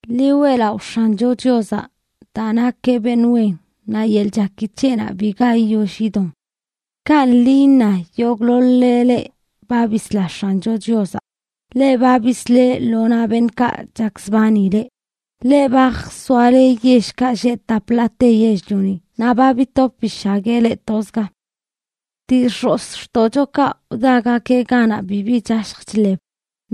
Ḻi weꞌlaꞌo X̱ancho Chiozaꞌ daa nakeꞌ beṉꞌ wen, naꞌ yeḻꞌ chaki c̱heꞌnaꞌ biga yiyoll yidon. Kanꞌ ḻi iṉa yogꞌḻoḻ-le leꞌ ba bisla X̱ancho Chiozaꞌ, leꞌ ba bisleꞌ lo naꞌ beṉꞌkaꞌ chakzbani leꞌ, leꞌ ba jsoale yellkaꞌ lleꞌ tap ḻaate yell-lioni naꞌ ba bitop bishagueꞌ leꞌ tozga. Dii x̱ozxtoꞌchokaꞌ wdagakeꞌ ganaꞌ bibi chashj chḻeb,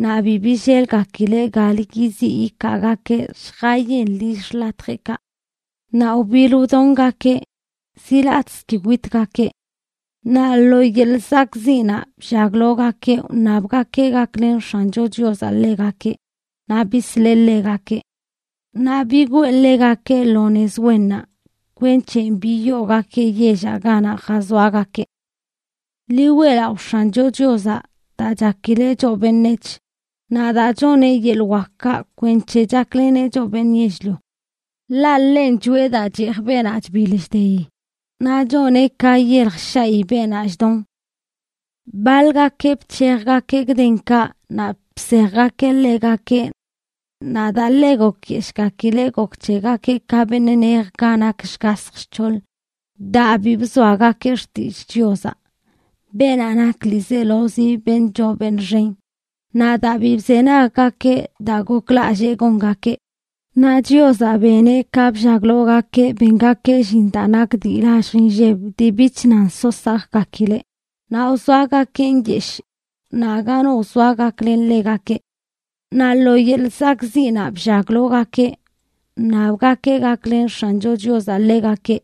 naꞌ bi billelgakileꞌ galə yiziꞌ yikaagakeꞌ lljayen lill xḻatjeꞌkaꞌ. Naꞌ wbiḻ wdongakeꞌ, ziꞌ latꞌzə ki witgakeꞌ. Naꞌ lo yeḻꞌ zakꞌziꞌnaꞌ bllaglogakeꞌ wṉabgakeꞌ gaklen X̱ancho Chiozaꞌ ḻegakeꞌ, naꞌ bisleꞌ ḻegakeꞌ. Naꞌ bigwee ḻegakeꞌ lo nez wennaꞌ, kwenc̱he biyoogakeꞌ yellaꞌ ganaꞌ jazoagakeꞌ. Ḻi weꞌlaꞌo X̱ancho Chiozaꞌ daa chakileꞌ choꞌ beṉec̱h, naꞌ daa choneꞌ yeḻꞌ wakkaꞌ kwenc̱he chakleneꞌ choꞌ beṉꞌ yell-lio. Ḻaꞌ ḻenꞌ choꞌe daa cheej beenaꞌ chbiḻ chdeyi, naꞌ choneꞌ ka yelj shaꞌyi beenaꞌ chdon. Baḻgakeꞌ bc̱hejgakeꞌ gdenkaꞌ naꞌ bsejgakeꞌ ḻegakeꞌ. Naꞌ daa ḻe gokyeshꞌgakileꞌ gok c̱hegakeꞌ ka beṉꞌ nej ga nak shgasj shc̱hoḻ, daa bi bzoagakeꞌ xtillꞌ Chiozaꞌ, beenaꞌ nak ḻiizelozi beṉꞌ choo beṉꞌ xen, naꞌ daa bi bzenaggakeꞌ daa goklallee gongakeꞌ. Naꞌ Chiozaꞌ beneꞌ ka bllaglogakeꞌ bengakeꞌ llin daa nak dii lallj nlleb, dii bich nan so sakgakileꞌ; naꞌ wzoagakeꞌ nyeshꞌ, naꞌ aga no wzoa gaklen ḻegakeꞌ. Naꞌ lo yeḻꞌ zakꞌziꞌnaꞌ bllaglaogakeꞌ wṉabgakeꞌ gaklen X̱ancho Chiozaꞌ ḻegakeꞌ,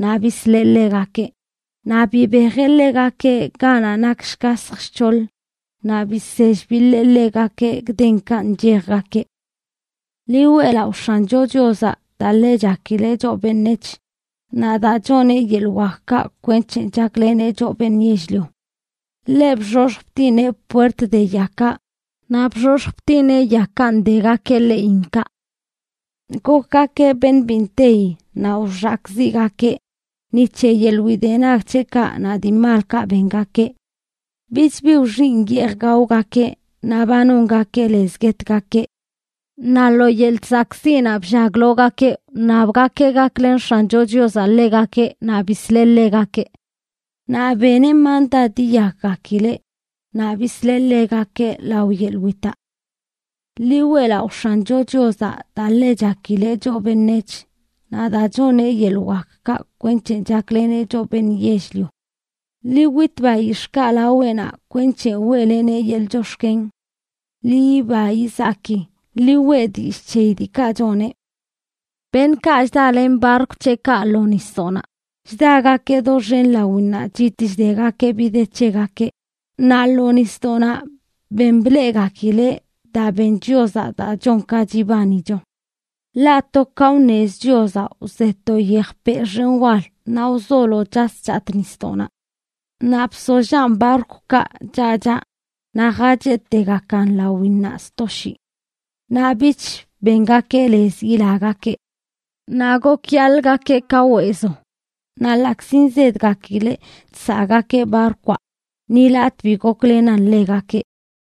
naꞌ bisleꞌ ḻegakeꞌ. Naꞌ bibejeꞌ ḻegakeꞌ ganaꞌ nak shgasj shc̱hoḻ, naꞌ bisell biḻee ḻegakeꞌ gdenkaꞌ nchejgakeꞌ. Ḻi weꞌlaꞌo X̱ancho Chiozaꞌ daa ḻe chakileꞌ choꞌ beṉec̱h, naꞌ daa choneꞌ yeḻꞌ wakkaꞌ kwenc̱he chakleneꞌ choꞌ beṉꞌ yell-lio. Ḻeꞌ bxoxj btineꞌ puert de yakaꞌ, naꞌ bxoxj btineꞌ yakaꞌ ndegakeꞌ ḻeꞌinkaꞌ. Gokgakeꞌ beṉꞌ bi nteyi naꞌ wxakꞌziꞌgakeꞌ ni c̱he yeḻꞌ widenag c̱heꞌkaꞌ naꞌ dii malkaꞌ bengakeꞌ. Bich bi wxinꞌ yeej gaogakeꞌ, naꞌ ba nongakeꞌ lez guetgakeꞌ. Naꞌ lo yeḻꞌ zakꞌziꞌnaꞌ bllaglaogakeꞌ wṉabgakeꞌ gaklen X̱ancho Chiozaꞌ ḻegakeꞌ, naꞌ bisleꞌ ḻegakeꞌ. Naꞌ beneꞌ mandad yiyakgakileꞌ; naꞌ bisleꞌ ḻegakeꞌ lao yeḻꞌ witaꞌ. Ḻi weꞌlaꞌo X̱ancho Chiozaꞌ daa ḻe chakileꞌ choꞌ beṉec̱h, naꞌ daa choneꞌ yeḻꞌ wakkaꞌ kwenc̱he chakleneꞌ choꞌ beṉꞌ yell-lio. Ḻi wit bayix̱ꞌkaꞌ laweꞌnaꞌ kwenc̱he weꞌleneꞌ yeḻꞌ chox̱ken. Ḻi yiba yizaki, ḻi weꞌ dillꞌ c̱heyi diikaꞌ choneꞌ. Beṉꞌkaꞌ chdalen barkw c̱heꞌkaꞌ lo nisdoꞌnaꞌ chdagakeꞌ doxen lawinnaꞌ chitꞌ chdegakeꞌ bi de c̱hegakeꞌ; naꞌ lo nisdoꞌnaꞌ ben bleꞌgakileꞌ daa ben Chiozaꞌ daa chon ka chibanicho. Ḻaꞌ to ka wṉez Chiozaꞌ wze to yejpeꞌ xen wal, naꞌ wzolo chas chatꞌ nisdoꞌnaꞌ. Naꞌ bsollaꞌn barkwkaꞌ chaꞌ chaꞌ, naꞌ jacheꞌtegakan lawinnaꞌ sto shii. Naꞌ bich bengakeꞌ lez yilagakeꞌ. Naꞌ gokyaḻgakeꞌ ka weezo, naꞌ ḻaꞌkzi nzedgakileꞌ chsaꞌgakeꞌ barkwaꞌ, ni latꞌ bi goklenan ḻegakeꞌ.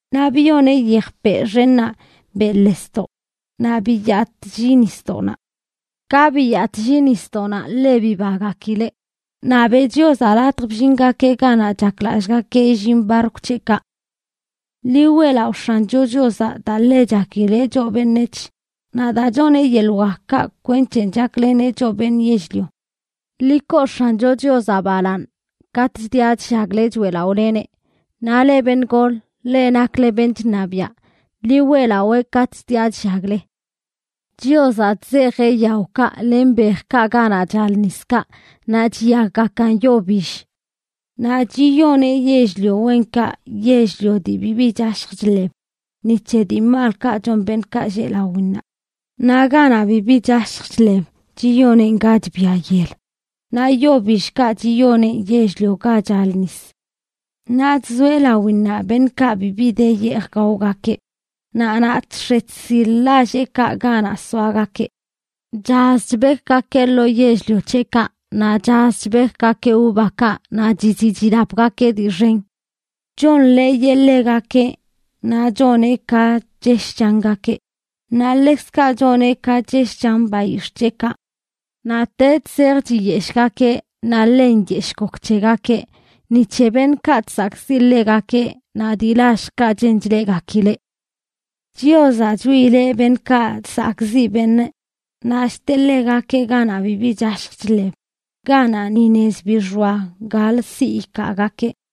Naꞌ biyoneꞌ yejpeꞌ xennaꞌ beꞌḻesdoꞌ, naꞌ biyatꞌlli nisdoꞌnaꞌ. Ka biyatꞌlli nisdoꞌnaꞌ ḻe bibagakileꞌ, naꞌ beꞌ Chiozaꞌ latj bllingakeꞌ ganaꞌ chaklallꞌgakeꞌ illin barkw c̱heꞌkaꞌ. Ḻi weꞌlaꞌo X̱ancho Chiozaꞌ daa ḻe chakileꞌ choꞌ beṉec̱h, naꞌ daa choneꞌ yeḻꞌ wakkaꞌ kwenc̱he chakleneꞌ choꞌ beṉꞌ yell-lio. Ḻi koo X̱ancho Chiozaꞌ balaaṉ katꞌ chdiꞌa chllagle choeꞌlaꞌoleneꞌ. Naꞌ leꞌ beṉꞌ gol, leꞌ nakle beṉꞌ chṉabiaꞌ, ḻi weꞌlawee katꞌ chdiꞌa chllagle. Chiozaꞌ chzeejeꞌ yaokaꞌ len bejkaꞌ ganaꞌ chal niskaꞌ, naꞌ chiyakgakan yo bill. Naꞌ chiyoneꞌ yell-lio wenkaꞌ yell-lio dii bibi chashj chḻeb, ni c̱he dii malkaꞌ chon beṉꞌkaꞌ lleꞌ lawinnaꞌ. Naꞌ ganaꞌ bibi chashj chḻeb chiyoneꞌn ga chbia yel, naꞌ yo billkaꞌ chiyoneꞌn yell-lio ga chal nis. Naꞌ chzoeꞌ lawinnaꞌ beṉꞌkaꞌ bibi de yeej gaogakeꞌ, naꞌ naꞌ chx̱e chsil lalleꞌkaꞌ ganaꞌ soagakeꞌ. Chaz chbekgakeꞌ lo yell-lio c̱heꞌkaꞌ, naꞌ chaz chbekgakeꞌ uvakaꞌ, naꞌ chiziꞌ chilapgakeꞌ dii xen. Chonḻeeyeꞌ ḻegakeꞌ, naꞌ choneꞌ ka chesh changakeꞌ, naꞌ ḻekzkaꞌ choneꞌ ka chesh chan bayix̱ꞌ c̱heꞌkaꞌ. Naꞌtech zej chiyeshꞌgakeꞌ naꞌ ḻe nyeshꞌ gok c̱hegakeꞌ ni c̱he beṉꞌkaꞌ chsakꞌziꞌ ḻegakeꞌ naꞌ dii lalljkaꞌ chen chleꞌgakileꞌ. Chiozaꞌ chwiileꞌ beṉꞌkaꞌ chsakꞌziꞌ beṉꞌ, naꞌ chteꞌ ḻegakeꞌ ganaꞌ bibi chashj chḻeb ganaꞌ ni nez bi xoa galə siꞌ ikaagakeꞌ.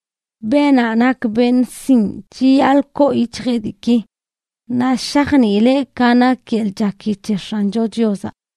Beenaꞌ nak beṉꞌ sinꞌ chiyaḻꞌ koo yic̱hjeꞌ diiki, naꞌ shajniileꞌ ka nak yeḻꞌ chaki c̱he X̱ancho Chiozaꞌ.